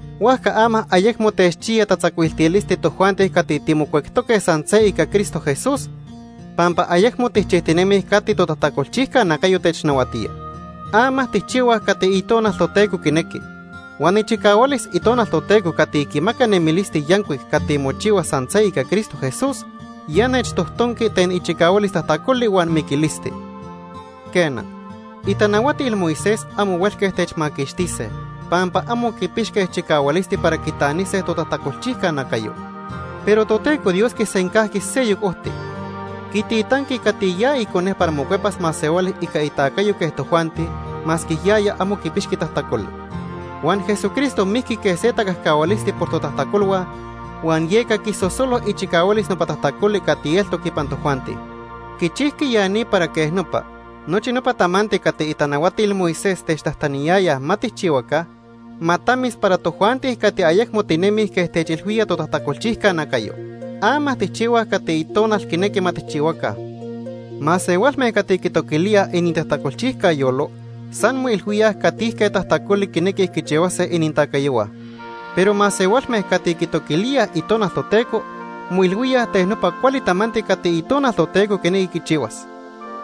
Huajca ama ayecmo techchiya tatzacuiltilisti tojuanti cati timocuectoque san se ica Cristo Jesús, pampa ayecmo tijchijtinemij cati totajtacolchijca nacayo technahuatía. Ama tijchihuaj cati Itonal Toteco quinequi. Huan ichicahualis Itonal Toteco cati quimaca nemilisti yancuic cati mochihua san se ica Cristo Jesús, ya nechtojtonqui ten ichicahualis tajtacoli huan miquilisti. Quena, itanahuatil Moisés amo huelque techmaquixtise, pampa amo quipixque chicahualisti para quitanise totajtacolchijca nacayo. Pero Toteco Dios quisencajqui seyoc ojti. Quititanqui cati ya Icone para mocuepas masehuali ica itacayo quej tojuanti, masque yaya amo quipixqui tajtacoli. Huan Jesucristo mijqui quej se tacajcahualisti por totajtacolhua huan yeca quisosolo ichicahualis nopa tajtacoli cati eltoc ipan tojuanti. Quichijqui ya ni para quej nopa, nochi nopa tamanti cati itanahuatil Moisés techtajtaniyayaj ma tijchihuaca, ma tamis para tojuanti cati ayecmo tinemij quej techilhuía totajtacolchijca nacayo. Ama tijchihuaj cati Itonal quinequi ma tijchihuaca. Masehualme cati quitoquilíaj inintajtacolchijca yolo san moilhuíaj catijque tajtacoli quinequij quichihuase inintacayohua. Pero masehualme cati quitoquilíaj Itonal Toteco moilhuíaj ten nopa cuali tamanti cati Itonal Toteco quinequi quichihuas.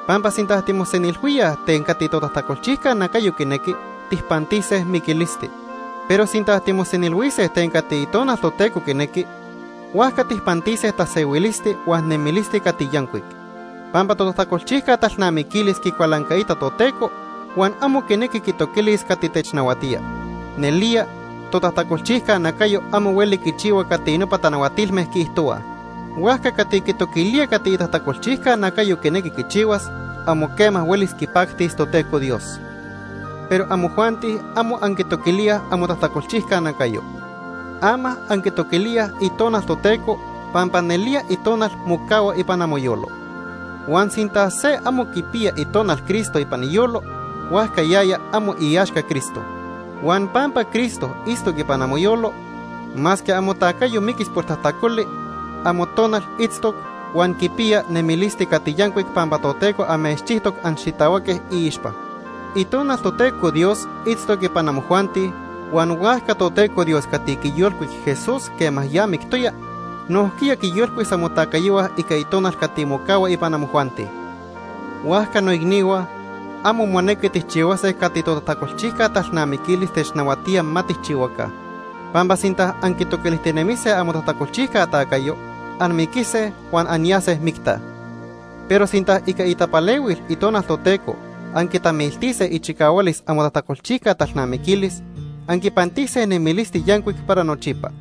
Pampa sinta timosenilhuíaj ten cati totajtacolchijca nacayo quinequi, tijpantise miquilisti. Pero sinta timosenilhuise ten cati Itonal Toteco quinequi, huajca tijpantise tasehuilisti huan nemilisti cati yancuic. Pampa totajtacolchijca talnamiquilis quicualancaita Toteco huan amo quinequi quitoquilis cati technahuatía. Nelía totajtacolchijca nacayo amo hueli quichihua cati nopa tanahuatilme quiijtohuaj. Huajca cati quitoquilía cati itajtacolchijca nacayo quinequi quichihuas, amo quema huelis quipactis Toteco Dios. Pero amojuanti amo anquitoquilíaj amotajtacolchijca nacayo. Ama anquitoquilíaj Itonal Toteco, pampa nelía Itonal mocahua ipan amoyolo. Huan sinta se amo quipiya Itonal Cristo ipan iyolo, huajca yaya amo iaxca Cristo. Huan pampa Cristo itztoc ipan amoyolo, masque amotacayo miquis por tajtacoli, amotonal itztoc huan quipiya nemilisti cati yancuic pampa Toteco amechchijtoc anxitahuaque iixpa. Itonal Toteco Dios itztoc ipan amojuanti, huan huajca Toteco Dios cati quiyolcuic Jesús quema ya mictoya, nojquiya quiyolcuis amotacayohua ica Itonal cati mocahua ipan amojuanti. Huajca noicnihua, amo monequi tijchihuase cati totajtacolchijca talnamiquilis technahuatía ma tijchihuaca. Pampa sinta anquitoquilijtinemise amotajtacolchijca tacayo, anmiquise huan anyase micta. Pero sinta ica itapalehuil Itonal Toteco anquitamiltise ichicahualis amotajtacolchijca talnamiquilis, anquipantise nemilisti yancuic para nochipa.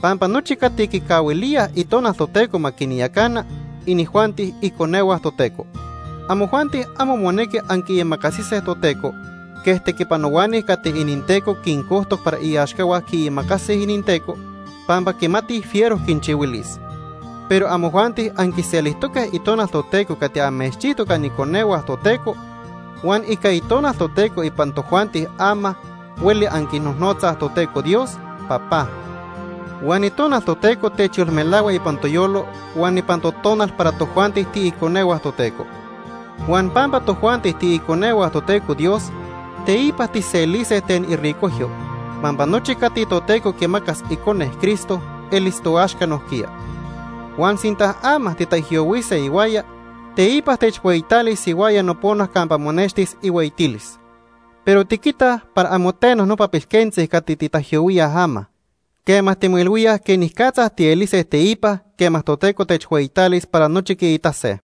Pampa nochi cati quicahuilíaj Itonal Toteco ma quinyacana, inijuanti iconehua Toteco. Amojuanti amo monequi anquiimacasise Toteco quej tequipanohuani cati ininteco quincojtoc para iaxcahua quiimacasij ininteco pampa quimatij fiero quinchihuilis. Pero amojuanti anquiselijtoque Itonal Toteco cati amechchijtoc aniconehua Toteco, huan ica Itonal Toteco ipan tojuanti ama hueli anquinojnotzaj Toteco Dios: “Papá.” Huan Itonal Toteco techyolmelahua ipan toyolo huan ipan totonal para tojuanti tiiconehua Toteco. Huan pampa tojuanti tiiconehua Toteco Dios, teipa tijselise ten iricojyo, pampa nochi cati Toteco quimacas Icone, Cristo, elis toaxca nojquiya. Huan sinta ama titaijyohuise ihuaya, teipa techhueyitalis ihuaya nopona campa monextis ihueyitilis. Pero tiquitaj para amo teno nopa pilquentzi cati titaijyohuíaj ama, quema timoilhuíaj quenicatza tielise teipa quema Toteco techhueyitalis para nochi quiitase.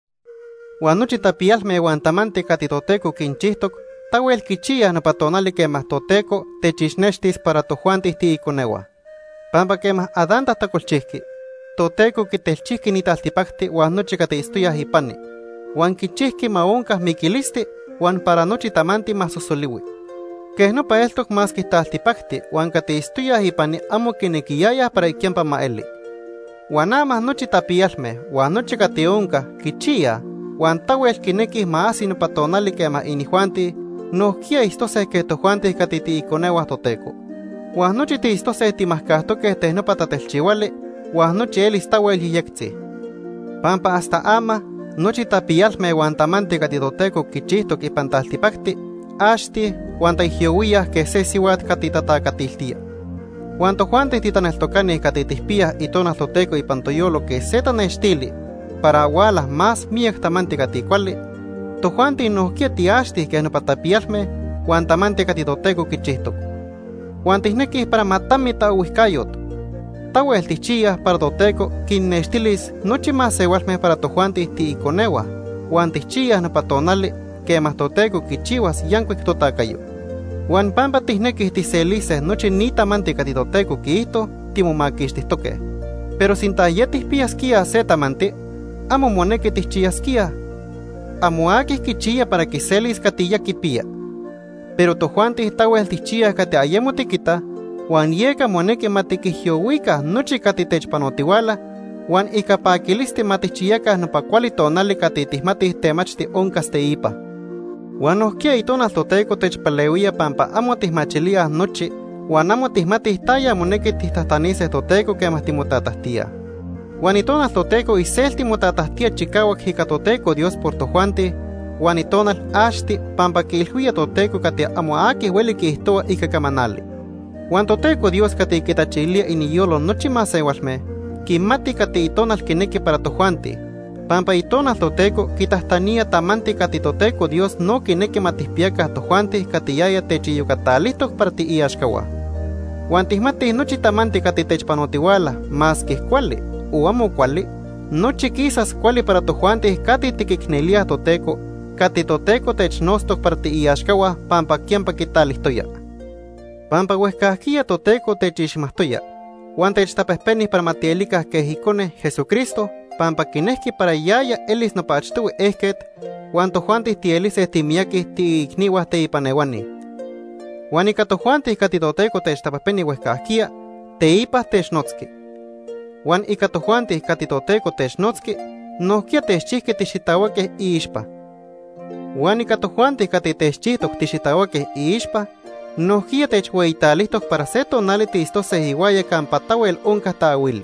Huan nochi tapiyalme huan tamanti cati Toteco quinchijtoc tahuel quichiyaj nopa tonali quema Toteco techixnextis para tojuanti tiiconehua. Pampa quema Adán tajtacolchijqui, Toteco quitelchijqui ni taltipacti huan nochi cati itztoyaj ipani huan quichijqui ma onca miquilisti huan para nochi tamanti ma sosolihui. Quej nopa eltoc masque taltipacti huan cati itztoyaj ipani amo quinequiyayaj para quiyampa ma eli. Huan ama nochi tapiyalme huan nochi cati onca quichiyaj, huan tahuel quinequij ma ajsi nopa tonali quema inijuanti nojquiya itztose quej tojuanti cati tiiconehua Toteco. Huan nochi tiitztose timajcajtoque ten nopa tatelchihuali, huan nochi elis tahuel yejyectzi. Pampa hasta ama nochi tapiyalme huan tamanti cati Toteco quichijtoc ipan taltipacti axtij huan taijyohuíaj quej se sihuat cati tatacatiltía. Huan tojuanti titaneltocani cati tijpiyaj Itonal Toteco ipan toyolo quej se tanextili para huala más miyac tamanti cati cuali, tojuanti nojquiya tiaxtij quej nopa tapiyalme huan tamanti cati Toteco quichijtoc. Huan tijnequij para ma tami taohuijcayot. Tahuel tijchiyaj para Toteco quinnextilis nochi masehualme para tojuanti tiiconehua, huan tijchiyaj nopa tonali quema Toteco quichihuas yancuic totacayo. Huan pampa tijnequij tijselise nochi ni tamanti cati Toteco quiijto, timomaquixtijtoque. Pero sinta ya tijpiyasquíaj se tamanti, amo monequi tijchiyasquíaj. Amo aqui quichiya para quiselis cati ya quipiya. Pero tojuanti tahuel tijchiyaj cati ayemo tiquitaj, huan yeca monequi ma tiquijyohuica nochi cati techpanotihuala, huan ica paquilisti ma tijchiyaca nopa cuali tonali cati tijmatij temachti oncas teipa. Huan nojquiya Itonal Toteco techpalehuía pampa amo tijmachilíaj nochi huan amo tijmatij taya monequi tijtajtanise Toteco quema timotatajtíaj. Huan Itonal Toteco iselti motatajtía chicahuac ica Toteco Dios por tojuanti huan Itonal axti pampa quiilhuía Toteco cati amo aqui hueli quiijtohua ica camanali. Huan Toteco Dios cati quitachilía iniyolo nochi masehualme, quimati cati Itonal quinequi para tojuanti, pampa Itonal Toteco quitajtanía tamanti cati Toteco Dios no quinequi ma tijpiyaca tojuanti cati yaya techiyocatalijtoc para tiiaxcahua. Huan tijmatij nochi tamanti cati techpanotihuala, masque cuali o amo cuali, nochi quisas cuali para tojuanti cati tiquicnelíaj Toteco, cati Toteco technotztoc para tiiaxcahua pampa quiyampa quitalijtoya. Pampa huejcajquiya Toteco techixmajtoya huan techtapejpeni para ma tielica quej Icone, Jesucristo, pampa quinejqui para yaya elis nopa achtohui ejquet huan tojuanti tielise timiyaqui tiiicnihua teipan ehuani. Huan ica tojuanti cati Toteco techtapejpeni huejcajquiya, teipa technotzqui. Huan ica tojuanti cati Toteco technotzqui, nojquiya techchijqui tixitahuaque iixpa. Huan ica tojuanti cati techchijtoc tixitahuaque iixpa, nojquiya techhueyitalijtoc para se tonali tiitztose ihuaya campa tahuel onca taahuili.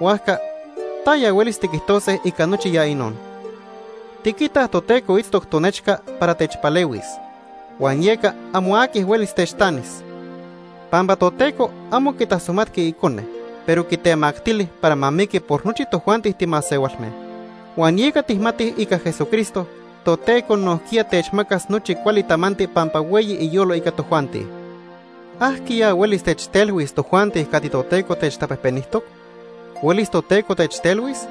Huajca ¿taya huelis tiquijtose ica nochi ya inon? Tiquitaj Toteco itztoc tonechca para techpalehuis, huan yeca amo aqui huelis techtanis. Pampa Toteco amo quitasomatqui Icone, pero quitemactili para ma miqui por nochi tojuanti timasehualme. Huan yeca tijmatij ica Jesucristo, Toteco nojquiya techmacas nochi cuali tamanti pampa hueyi iyolo ica tojuanti. ¿Ajquiya huelis techtelhuis tojuanti cati Toteco techtapejpenijtoc? ¿Huelis Toteco techtelhuis?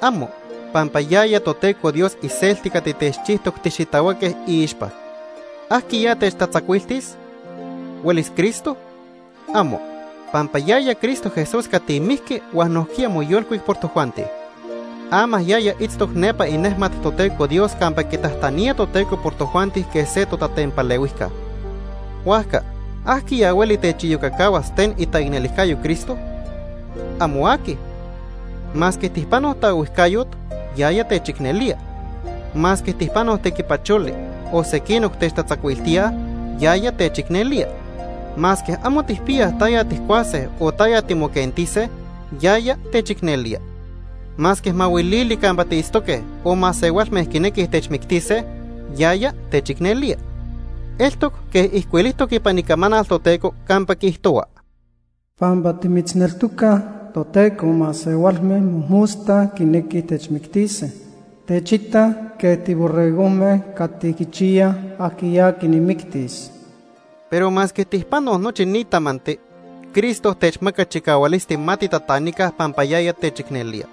¡Amo! Pampa yaya Toteco Dios iselti cati techchijtoc tixitahuaque iixpa. ¿Ajquiya techtatzacuiltis? ¿Huelis Cristo? ¡Amo! Pampa yaya Cristo Jesús cati mijqui huan nojquiya moyolcuic por tojuanti. Ama yaya itztoc nepa inejmat Toteco Dios campa quitajtanía Toteco por tojuanti quej se totatempalehuijca. Huajca ¿ajquiya hueli techiyocacahuas ten itaicnelijcayo Cristo? ¡Amo aqui! Masque tijpanoj taohuijcayot, yaya techicnelía. Masque tijpanoj tequipacholi, o sequinoc techtatzacuiltíaj, yaya techicnelía. Masque amo tijpiyaj taya tijcuase o taya timoquentise, yaya techicnelía. Masque mahuilili campa tiitztoque o masehualme quinequij techmictise, yaya techicnelía. Eltoc quej ijcuilijtoc ipan Icamanal Toteco campa quiijtohua: “Pampa timitzneltocaj, Toteco, masehualme mojmosta quinequij techmictise. Techitaj quej tiborregojme cati quichiyaj ajquiya quinmictis.” Pero masque tijpanoj nochi ni tamanti, Cristo techmaca chicahualisti ma titatanica pampa yaya techicnelía.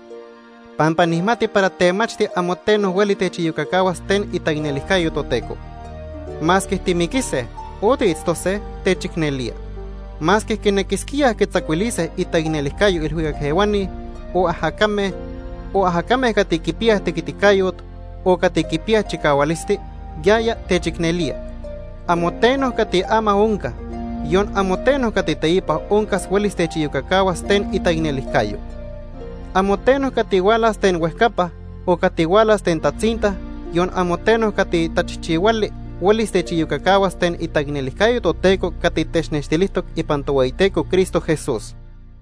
Pampa nijmati para temachti amo teno hueli techiyocacahuas ten itaicnelijcayo Toteco. Masque timiquise o tiitztose, techicnelía. Masque quinequisquíaj quitzacuilise itaicnelijcayo ilhuicac ehuani, o ajacame, o ajacame cati quipiyaj tequiticayot o cati quipiyaj chicahualisti, yaya techicnelía. Amo teno cati ama onca, yon amo teno cati teipa oncas huelis techiyocacahuas ten itaicnelijcayo. Amo teno cati hualas ten huejcapa, o cati hualas ten tatzinta, yon amo teno cati tachijchihuali, huelis techiyocacahuas ten itaicnelijcayo Toteco cati technextilijtoc ipan Tohueyiteco Cristo Jesús.